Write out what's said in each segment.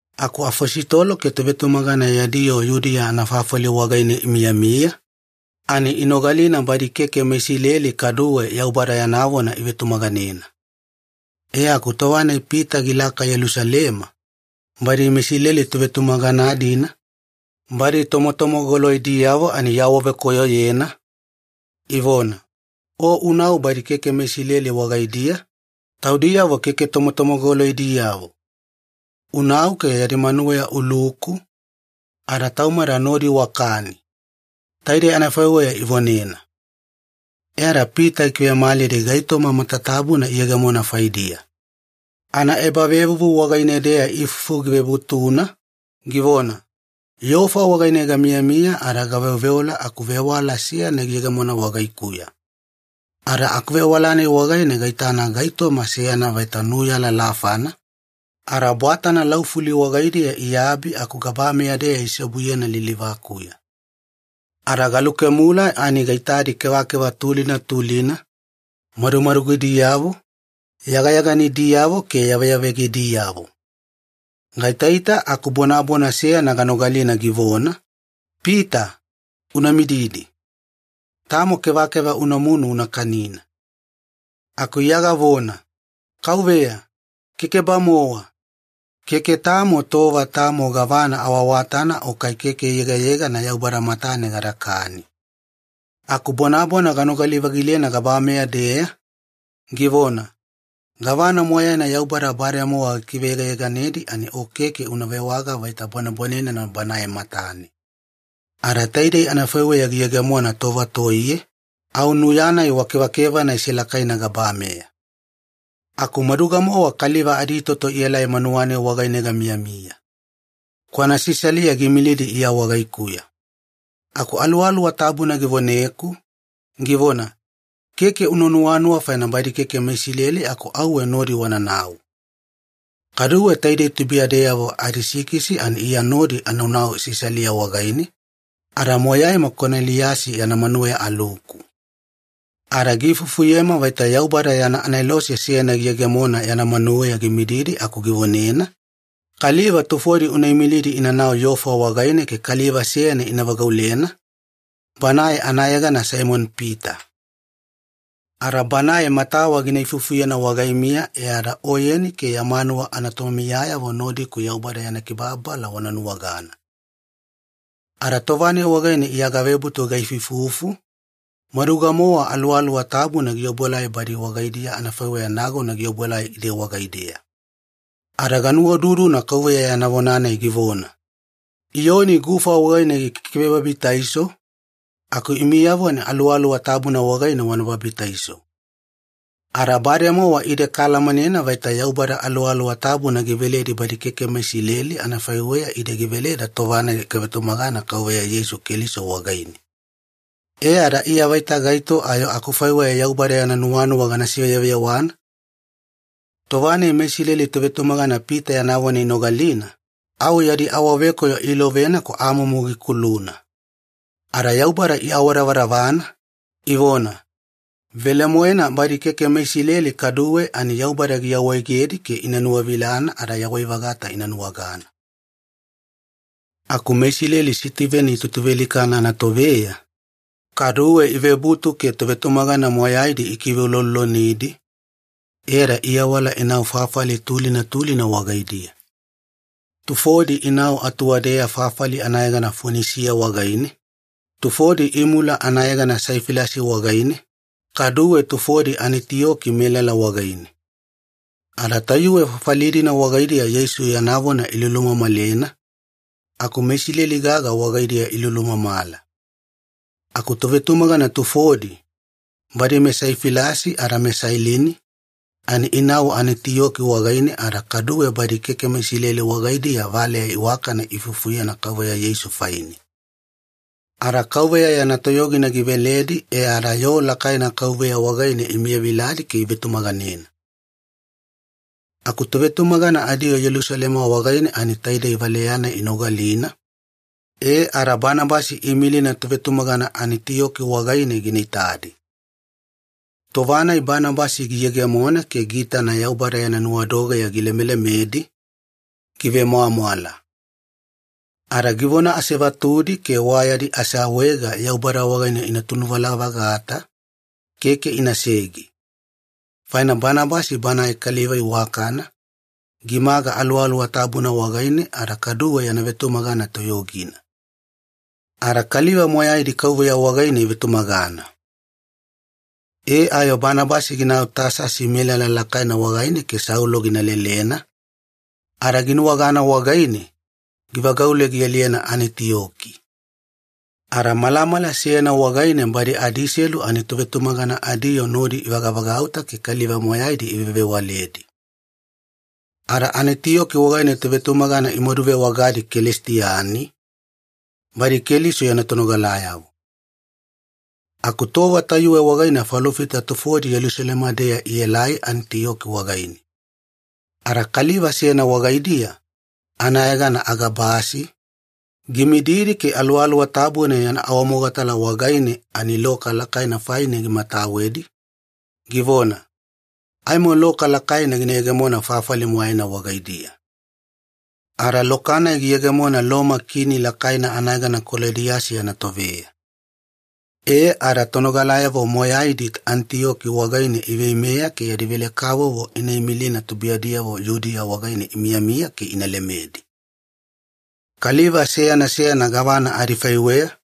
Aku afositolo ke tovetumagana yadi yoo Yudiya anafafali wagaine imiyamiya, ani inogalina badi keke meIsileli kaduwe Yaubada yana vona ivetumaganena. E aku tova-nai Pita gilaka Yelusalema, badi meIsileli tovetumagana-dina, badi tomotomogoloidiyavo ani iawavekoyoyena, ivona, “O unau badi keke meIsileli wagaidiya, taudiyavo keke tomotomogoloidiyavo. Unau ke yadi manuweya uluku, ada taumada nodi wakani!” Taidei anafaiweya ivonena. E ada Pita gikivemalidi gaitoma matatabuna iyegemona faidiya. Anaebavevuvu wagaine-deya ifufu givebutuna, givona, “Yofa wagaine gamiyamiya ada gaveoveola aku vewala seyana giyegemona wagaikuya. Ada akuvewala-nai wagaine gaitana gaitoma seyana vaita nuya lalafana, ada bwatana laufuli wagaidiya iabi aku gabameya-deya iseobuyena lilivakuya. Ada galukemula ani gaitadi kevakeva tulina tulina, madumadugidiyavo, yagayaganidiyavo ke yaveyavegadiyavo. Gaitaita aku bonabona seyana ganogalina givona, ‘Pita, una mididi. Tamo kevakeva unamunu una kanina.’ “Aku Iya gavona, ‘Kauveya, keke-bamowa! Keke tamo tova tamo gavana awaawatana o kai keke yegayegana Yaubada matane gadakani.’ “Aku bonabona ganogali-vagilena gabameya-deya, givona, ‘Gavana moyaina Yaubada bademowa gikiveyegayeganedi ani o keke una vewaga vaita bwanebwanenena Banae matane.’ Ada taidei anafaiweya giyegemona tova toiye, au nuya-nai wa kevakevana isilakaina gabameya. “Aku maduga-mowa kaliva aditoto ielai manuwa-nai wagaine gamiyamiya. Kwana Sisalia giimilidi Iya wagaikuya. Aku Aluwaluwa Tabuna givoneku, givona, ‘Keke una nuwanuwa faina badi keke meIsileli aku auwe nodi wananau.’ Kaduwe taidei tubuiyadeyavo adisikisi ani Iya nodi anau Sisalia wagaine, ada moyaima Koneliyasi yana manuweya aluku. Ada giifufuyema vaita Yaubada yana anelose seyana giyegemona yana manuweya gimididi aku givonena, ‘Kaliva tufodi una imilidi inanau Yofa wagaine ke kaliva seyana ina vagaulena, banae anayegana Saimoni-Pita. Ada banae matawa gina ifufuyena wagaimiya e ada oyeni ke ya manuwa anatomiyayavo nodiku Yaubada yana kibababala wana nuwagana.’ “Ada tova-nai wagaine Iya gavebutu gaifuifufu, maduga-mowa Aluwaluwa Tabuna giobuelai badi wagaidiya anafaiweya nagona giobuelai ide wagaideya. Ada ganuwaududuna Kauveya yana vona-nai givona, ‘Iyoni gufa wagaine gikikivebabitaiso, aku imiyavo ani Aluwaluwa Tabuna wagaine wana babitaiso.’ Ada bademowa ide kaalamanena vaita Yaubada Aluwaluwa Tabuna giveledi badi keke meIsileli anafaiweya ide giveleda tova-nai kavetumagana Kauveya Yeisu Keliso wagaine. E ada Iya vaita gaito ayo akufaiweya Yaubada yana nuwanuwa gana siveyeveyewana?” Tova-nai meIsileli tovetumagana Pita yana vona inogalina, au yadi awavekoyo iilovena aku amumu gikuluna. Ada Yaubada iawadavadavana, ivona, “Velemoena badi keke meIsileli kaduwe ani Yaubada giawaegedi ke ina nuwavilana ada yawai-vagata ina nuwagana.” Aku meIsileli Sitiveni itutuvealikana anatoveya, kaduwe ivebutu ke tovetumagana moyaidi ikiveuloulolonidi, e ada iawala inau fafali tulina tulina wagaidiya. Tufodi inau atuwadeya fafali anayegana Fonisiya wagaine, tufodi imula anayegana Saifilasi wagaine, kaduwe tufodi Anitiyoki melala wagaine. Ada tayuwe fafali-dina wagaidiya Yeisu yana vona ilulumamalena, aku meIsileli gaga wagaidiya ilulumamala. Aku tovetumagana tufodi, badi meSaifilasi ada meSailini, ani inau Anitiyoki wagaine ada kaduwe badi keke meIsileli wagaidiya valeya iwakana iifufuyena Kauveya Yeisu faine. Ada Kauveya yana toyogina giveledi e ada yoo lakaina Kauveya wagaine imiyaviladi ke ivetumaganena. Aku tovetumagana adiyoo Yelusalema wagaine ani taidei valeya-nai inogalina, e ada Banabasi iimilina tovetumagana Anitiyoki wagaine gina itadi. Tova-nai Banabasi giyegemona ke giitana Yaubada yana nuwadogeya gilemelemedi, givemwamwala. Ada givona asevatudi ke wa yadi aseawaega Yaubada wagaine ina tunuvala-vagata, keke inasege. Faina Banabasi banae kaliva iwakana, gimaga Aluwaluwa Tabuna wagaine ada kaduwe yana vetumagana toyogina. Ada kaliva moyaidi Kauveya wagaine ivetumagana. E ayo Banabasi ginau Tasasi melala lakaina wagaine ke Saulo gina lelena, ada ginuwagana wagaine, givagaule gialiyena Anitiyoki. Ada malamala seyana wagaine, badi adiselu ani tovetumagana adiyoo nodi ivagavagauta ke kaliva moyaidi ivevewaledi. Ada Anitiyoki wagaine tovetumagana imaduvewagadi ‘Kelisitiani’, badi Keliso yana tonogalayavo. Aku tova tayuwe wagaine falofita tufodi Yelusalema-deya ielai Anitiyoki wagaine. Ada kaliva seyana wagaidiya, anayegana Agabasi, gimididi ke Aluwaluwa Tabuna yana awamogatala wagaine ani loka lakaina faina gimatawedi, givona, “Aimo loka lakaina gina yegemona fafali moyaina wagaidiya.” Ada loka-nai giyegemona Loma kini lakaina anayegana Kolodiyasi yana toveya. E ada tonogalayavo moyaidi Anitiyoki wagaine iveimeya ke yadi velekavovo ina imilina tubuiyadiyavo Yudiya wagaine imiyamiya ke ina lemedi. Kaliva seyana seyana gavana adifaiweya,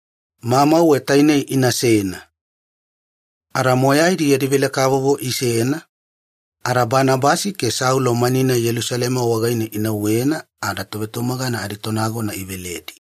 mamauwe tainei inasena. Ada moyaidi yadi velekavovo isena, ada Banabasi ke Saulo mani-nai Yelusalema wagaine inauwena ada tovetumagana aditonagona iveledi.